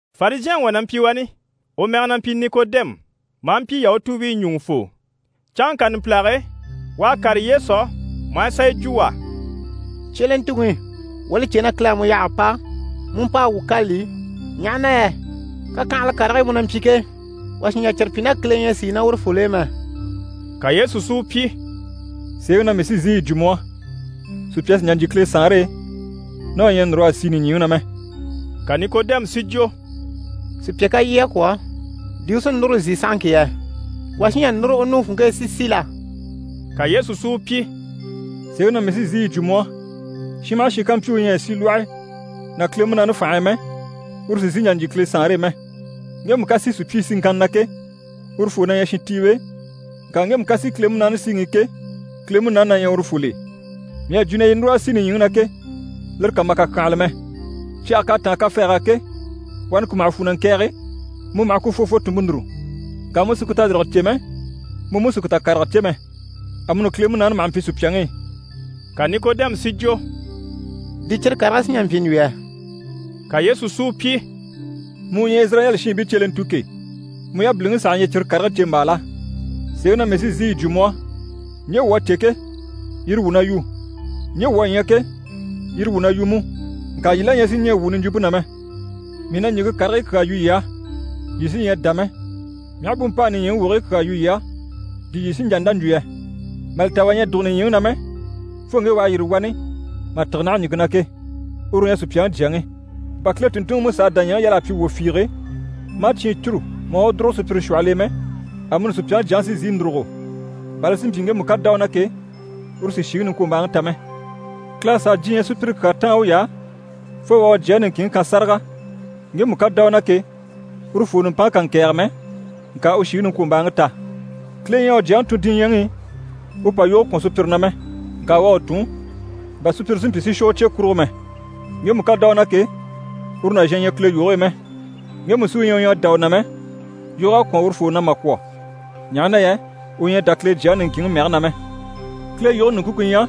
Farizhɛnŋi wà na mpyi wani, u mɛge na mpyi Nikodɛmu, maa mpyi Yahutuubii ɲùŋufoo. Canŋka numpilage e, u à kàre Yesu á maa sà yi jwo u á: «Cyelentuŋi, wuu à li cè na Kile à mu yaha a pa, mu u mpa a wuu kâlali, ɲaha na yɛ kakyanhala karigii mu na mpyi ke, wà sì n‑jà cyire pyi ná Kile ɲyɛ a sìi ná urufol'e mɛ.» Ka Yesu si u pyi: «Sèeŋi na mii sí n‑sìi yi jwo mu á, sùpya sì n‑jà n‑jyè Kile Saanre e, ná u ɲyɛ a núr'a si nìɲyiŋi na mɛ.» Ka Nikodɛmu si jwo: «Sùpya ká lyɛ a kwɔ̀, di u sí núru n‑si sahaŋki yɛ? Wà sí n‑jà núru u nuŋi funŋke e si si la?» Ka Yesu si u pyi: «Sèeŋi na mii sí n‑sìi yi jwo mu á, shin maha shin ká mpyi u ɲyɛ a si lwɔhe ná Kile Munaani fànhe e mɛ, uru sì n‑sìi n‑jà n‑jyè Kile Saanre e mɛ. Ŋgemu ká si sùpyii siŋkanna na ke, urufoo na ɲyɛ shintiiwe, ŋka ŋgemu ká si Kile Munaani síŋi i ke, Kile Munaani na ɲyɛ urufol'e. Mii à jwo na yii núr'a si nìɲyiŋi na ke, lire kà ma kàkyanhala mɛ. Cyage k'à táan kafɛɛg'á ke, wani ku maha fwu na ŋkɛ̀ɛge, mu maha ku fwɔfwɔ tùnmpe núru. Ŋka mu sì ku tayirige cè mɛ, mu mú sì ku takarege cè mɛ. Amuni Kile Munaani maha mpyi sùpyaŋi i.» Ka Nikodɛmu si jwo: «Di cyire karigii sí n‑jà n‑pyi n‑jwo yɛ?» Ka Yesu si u pyi: «Mu u ɲyɛ Izirayɛli shiinbii cyelentu ke, mu yabiliŋi saha ɲyɛ cyire karigii ɲcèmbaa la? Sèeŋi na mii sí n‑sìi yi jwo mu á, ɲje wuu à cè ke, yire wuu na yu. Ɲje wuu à ɲya ke, yire wuu na yu mú. Ŋka yii la ɲyɛ sì ɲɛɛ wuu niɲjwumpe na mɛ. Mii na ɲìŋke karigii kyaa yu yii á, yii sí ɲyɛ a dá mɛ, mii aha bú mpa a nìɲyiŋi wogigii kyaa yu yii á, di yii sí n‑jà n‑dá n‑jwo yɛ? Mà li ta wà ɲyɛ a dùgo nìɲyiŋi na mɛ, fo ŋge u à yîri wani mà tîge naha ɲìŋke na ke, uru u ɲyɛ Supyaŋi Jyaŋi. Bà Kile tùnntunŋiMusa à dàɲyɛŋi yal'a pyi wwò fiige, maa cyiin cûru, maa u dùrugo sùpyire shwɔhɔl'e mɛ, amuni Supyaŋi Jyaŋi sí n‑sìi n‑dùrugo, bà li si mpyi ŋgemu ká dá u na ke, uru si shìŋi niŋkwombaaŋi ta mɛ.» Kile à sàa diɲyɛ sùpyire kyaa táan uy'á fo u à u Jyaŋi niŋkinŋi kan sáraga, ŋgemu ká dá u na ke, urufoo nùmpanŋke kà ŋkɛ̀ɛge mɛ, ŋka u shìŋi niŋkwombaaŋi ta. Kile ɲyɛ a u Jyaŋi tun diɲyɛŋi i u pa yoge kwɔ̀n sùpyire na mɛ. Ŋka u à u tun, bà sùpyire si mpyi si shwɔ u cye kurugo mɛ. Ŋgemu ká dá u na ke, uru nàzhan ɲyɛ Kile yoge e mɛ. Ŋgemu sí u ɲyɛ u ɲyɛ a dá u na mɛ, yog'à kwɔ̀n urufoo na mà kwɔ̀, ɲaha na yɛ u ɲyɛ a dá Kile Jyaŋi niŋkinŋi mɛge na mɛ. Kile yoge ɲùŋke ku ɲyɛ: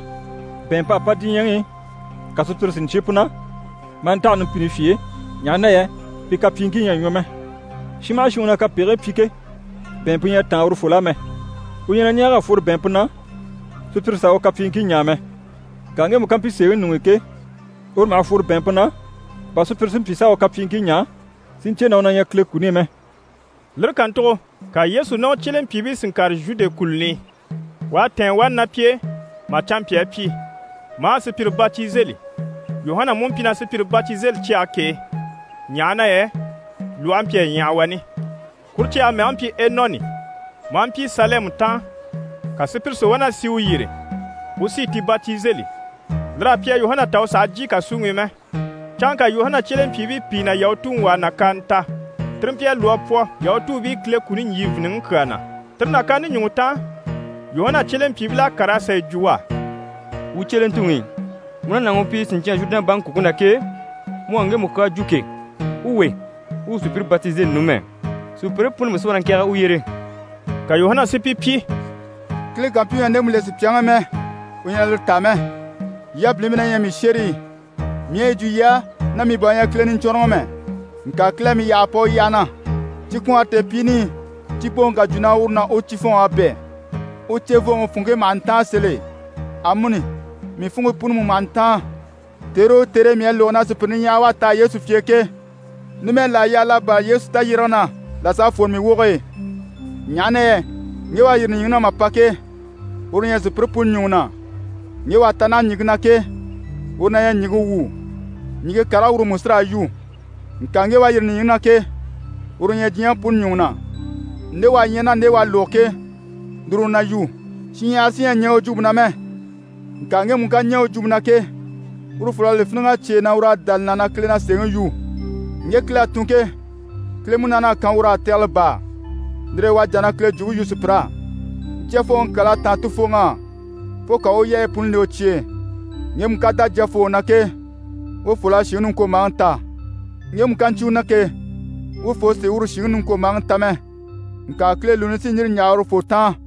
bɛ̀ɛnmp'à pa diɲyɛŋi i, ka sùpyire si ɲcyé pu na, maa ntaha numpini fye e, ɲaha na yɛ pi kapyiiŋkii ɲyɛ a ɲwɔ mɛ. Shin maha shin u na kapegigii pyi ke, bɛ̀ɛnmpe ɲyɛ a táan urufol'á mɛ. U ɲyɛ na ɲɛɛg'a fworo bɛ̀ɛnmpe na, sùpyire s'a u kapyiiŋkii ɲaa mɛ. Ŋka ŋgemu ká mpyi sèeŋi ɲuŋ'i ke, uru maha fworo bɛ̀ɛnmpe na, bà sùpyire si mpyi s'a u kapyiiŋkii ɲaa, si ɲcè na u na ɲyɛ Kile kuni i mɛ. Lire kàntugo ka Yesu ná u cyelempyiibii si ŋkàre Zhude kùluni i. U à tɛ̀ɛn wani ná pi e mà canmpyaa pyi, marii sùpyire batizeli. Yuhana mú mpyi na sùpyire batizeli cyage k'e, ɲaha na yɛ lwɔhe mpyi a ɲyaha wani. Kuru cyage mɛge mpyi Enɔni, maa mpyi Salɛmi taan. Ka sùpyire si wá na sì u yyére, u sí i ti batizeli. Lir'à pyi a Yuhana ta u sàha jyè kàsuŋi i mɛ. Canŋka Yuhana cyelempyiibii pìi ná Yahutuŋi wà à nàkaana ta. Tire mpyi a lwɔ́ a pwɔ Yahutuubii Kile kuni ɲjyìviniŋi kyaa na. Tire nàkaante ɲùŋɔ taan, Yuhana cyelempyiibil'à kàr'a sà yi jwo u á: «Wuu cyelentuŋi, mu ná nàŋi u mpyi siɲcyan Zhurudɛn baŋi kùŋke na ke, mu à ŋgemu kyaa jwo ke, u we, u u sùpyire batizeli numɛ. Sùpyire puni mú si wá na ŋkɛ̀ɛge u yyére.» Ka Yuhana si pi pyi: «Kile ká mpyi u ɲyɛ a ndemu le sùpyaŋi i mɛ, u ɲyɛ na lire taa mɛ. Yii yabilimpii na ɲyɛ mii shérii, mii à yi jwo yii á na mii bà u ɲyɛ Kile Niɲcwɔnrɔŋi mɛ, ŋka Kile à mii yaha a pa u yyaha na. Cikwɔɔnre tèepyiini i, cipooŋi ká jwo na uru ná u cifɔnŋ'à bɛ̂, u cevooŋi funŋke maha ntáan sèl'e. Amuni, mii funŋke puni mú maha ntáan, tère o tère e mii à lógo na sùpyire niɲyahara wá a taha Yesu fye e ke. Numɛ, là à yaa l'a bârali Yesu tayyérege na, là s'a fwore mii woge e, ɲaha na yɛ ŋge u à yîri nìɲyiŋi na mà pa ke, uru u ɲyɛ sùpyire puni ɲùŋɔ na. Ŋge u à ta naha ɲìŋke na ke, uru na ɲyɛ ɲìŋke wu, ɲìŋke karigii uru mú sí raa yu. Ŋka ŋge u à yîri nìɲyiŋi na ke, uru u ɲyɛ diɲyɛŋi puni ɲùŋɔ na. Nde u à ɲya, ná nde u à lógo ke, lire u na yu, shinɲyahara sí ɲyɛ a ɲɛɛ u jwumpe na mɛ. Ŋka ŋgemu ká ɲɛɛ u jwumpe na ke, urufol'à li fíniŋ'a cyêe na ur'à dá li na na Kile na sèeŋi yu. Ŋge Kile à tun ke, Kile Munaani à kan ur'á tɛgɛlɛ baa, lire e u à jà na Kile jwumpe yu sùpyir'á. Jyafooŋi kyal'à táan Tufooŋi á, fo ka u u yaayi puni le u cye e. Ŋgemu ká dá Jyafooŋi na ke, urufol'à shìŋi niŋkwombaaŋi ta. Ŋgemu ká ɲcyé u na ke, urufoo sì uru shìŋi niŋkwombaaŋi ta mɛ, ŋka Kile lùuni sí n‑yîri n‑yaha urufoo taan.»